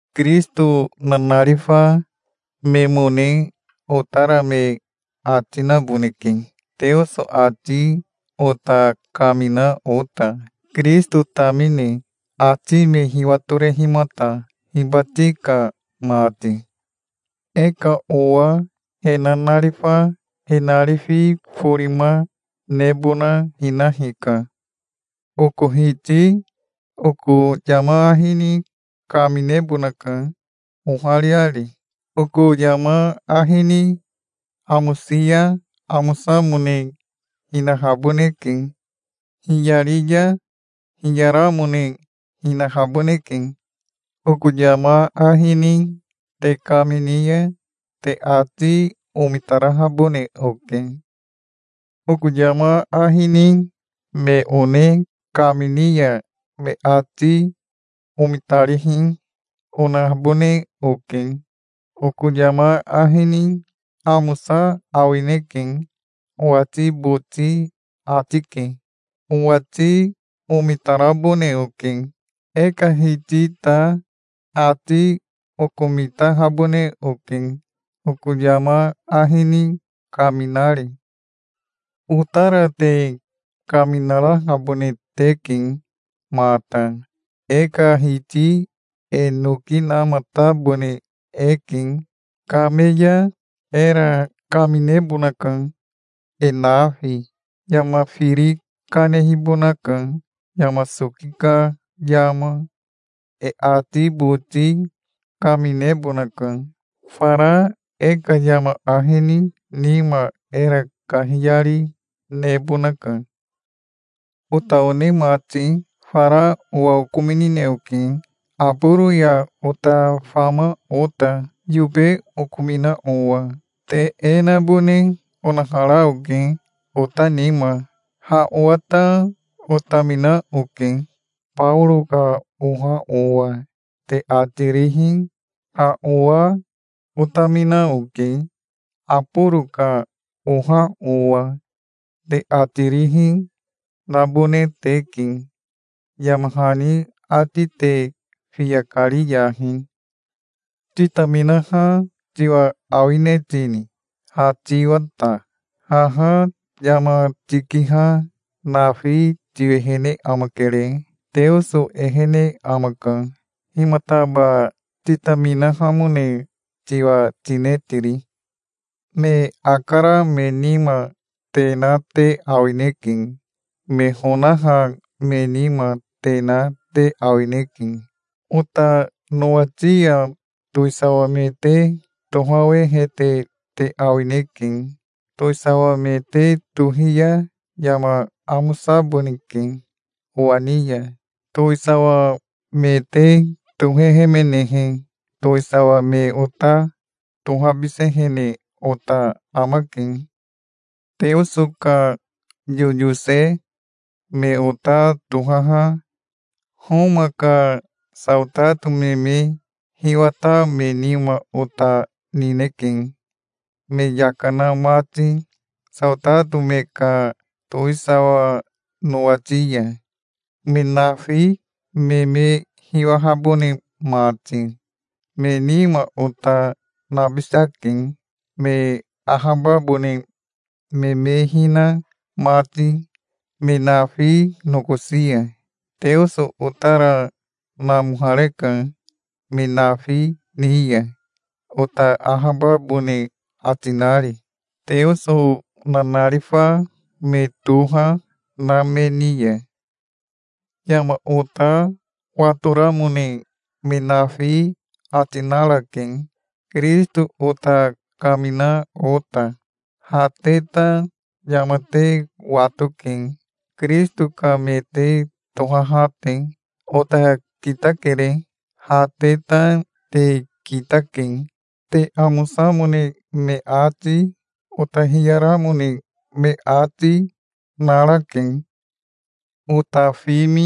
Kirisito nanarifa memone otara me ati naboneke, Teoso ati ota kamina ota, Kirisito tamine, ati me hiwatorehimata hibati ka mati. E ka owa he nanarifa he narifi forima nebona hina hika. Oko Hiti oko yama ahi ni kaminebonaka ohariari. Oko yama ahi ni amosi ya amosamone hinahaboneke. Hiyari ya hiyaramone hinahaboneke. Oko yama ahi ni te kamini ya te ati omitarahabone oke. Oko yama ahi ni me one kamini ya me ati omitarihi, onahabone oke. Oko yama ahi ni amosa awineke owati boti ati ke. Owati omitarabone oke. E ka Hiti ta ati okomitahabone oke, oko yama ahi ni kaminari. Otara te kaminarahabone teke mata. E ka Hiti e noki namatabone eke. Kame ya era kaminebonaka, e nafi. Yama firi kanehibonaka, yama soki ka yama. E ati boti kaminebonaka. Fara e ka yama ahi ni nima era kahiyari nebonaka. Ota one mati, fara owa okominine oke Aboro ya ota fama ota, yobe okomina owa. Te e nabone onahara oke, ota nima. "Ha owa ta otamina oke, Baoro ka oha owa", te ati rihi, "Ha owa otamina oke, Aboro ka oha owa", te ati rihi nabone teke. Yama hani ati te fiya kariyahi. Titaminaha tiwa awine tini, ha tiwa ta? Haha yama tikiha nafi tiwehene amakere. Teoso ehene amaka. Himataba titaminahamone tiwa tine tiri? Me akara me nima te na te awineke. Me honaha me nima te na te awineke. Ota nowati ya towisawa me te tohawehete te awineke. Towisawa me te tohi ya yama amosaboneke owa ni ya. Towisawa me te tohehemenehe towisawa me ota tohabisehene ota amake. Teoso ka yoyose me ota tohaha Homa ka saotato me me hiwata me nima ota nineke, me yaka na mati saotato me ka towisawa nowati ya, me nafi me me hiwahabone mati. Me nima ota nabisake, me ahababone me me hina mati me nafi nokosi ya. Teoso otara namohareka me nafi ni ya, ota ahababone ati nari, Teoso nanarifa me toha na me ni ya. Yama ota watoramone me nafi ati narake, Kirisito ota kamina ota. Ha te ta yama te watoke, Kirisito ka me te tohaha te. Ota kitakere. Ha te ta te kitake. Te amosamone me ati, ota hiyaramone me ati, narake. Ota fimi,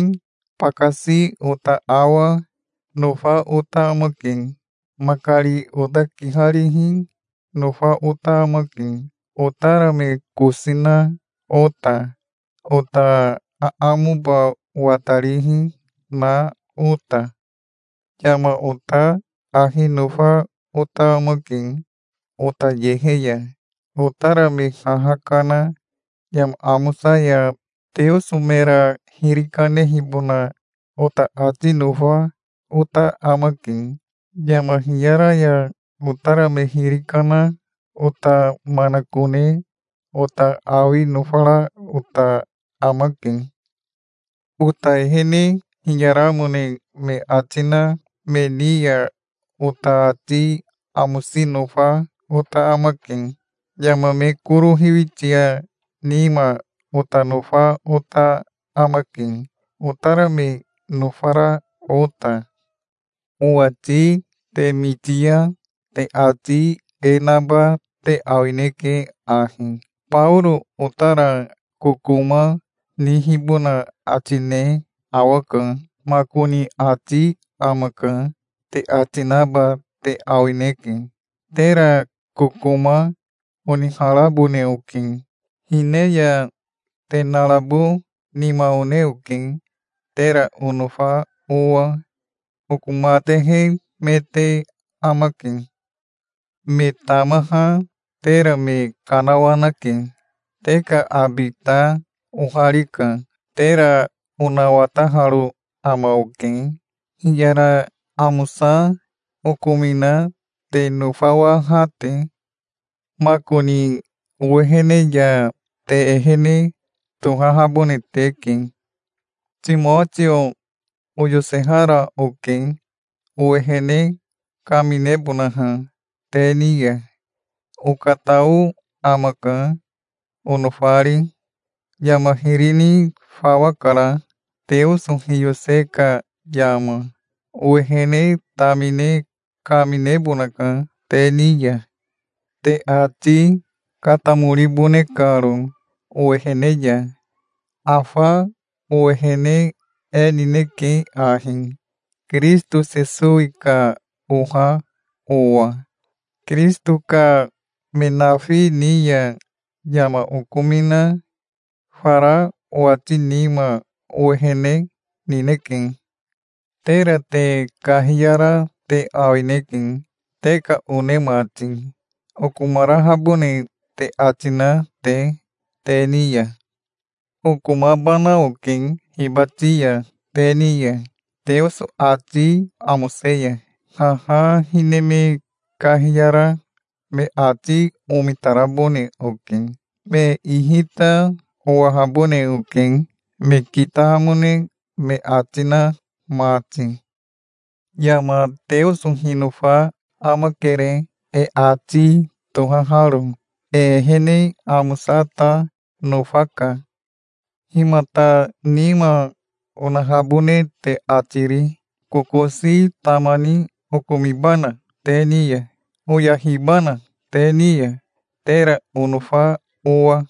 bakasi ota awa, nofa ota amake. Makari ota kiharihi nofa ota amake, otara me kosi, na ota, ota aamoba watarihi, na ota. Yama ota ahi nofa ota amake ota yehe ya. Otara me haha kana yama amosa ya Teoso mera hiri kanehibona ota ati nofa ota amake. Yama hiyara ya otara me hiri kana ota manakone ota awi nofara ota amake. Ota ehene hiyaramone me ati na me ni ya ota ati amosi nofa ota amake. Yama me koro hiwitia nima ota nofa ota amake, otara me nofara ota. Owati te miti ya te ati e naba te awineke ahi: "Baoro otara kokoma nihibona ati ne awaka makoni ati amaka", te ati naba te awineke. Tera kokoma oniharabone oke. Hine ya te narabo nima one oke, tera onofa owa. Oko matehe me te amake. Me tamaha tera me kanawanake. Te ka abi ta oharika. Tera onawataharo ama oke, hiyara amosa okomina te nofawaha te. Makoni owehene ya te ehene tohahabone teke. Timotio oyosehara oke, owehene kaminebonaha te ni ya. Okatao amaka, onofari. Yama hiri ni fawa kara, Teoso hiyose ka yama. Owehene tamine kaminebonaka te ni ya, te ati katamoribone karo owehene ya. Afa owehene e nineke ahi Kirisito Sesowi ka oha owa. Kirisito ka me nafi ni ya yama okomina fara owati nima owehene nineke. Tera te kahiyara te awineke, te ka one mati, okomarahabone te ati na te, te ni ya. Okomabana oke hibati ya te ni ya, Teoso ati amose ya. Haha hine me kahiyara me ati omitarabone oke. Me ihi ta owahabone oke, me kitahamone me ati na mati. Yama Teoso hinofa amakere, e ati tohaharo. E ehene amosa ta nofaka. Himata nima onahabone te ati ri? Kokosi tama ni okomibana te ni ya? Oyahibana te ni ya, tera onofa owa?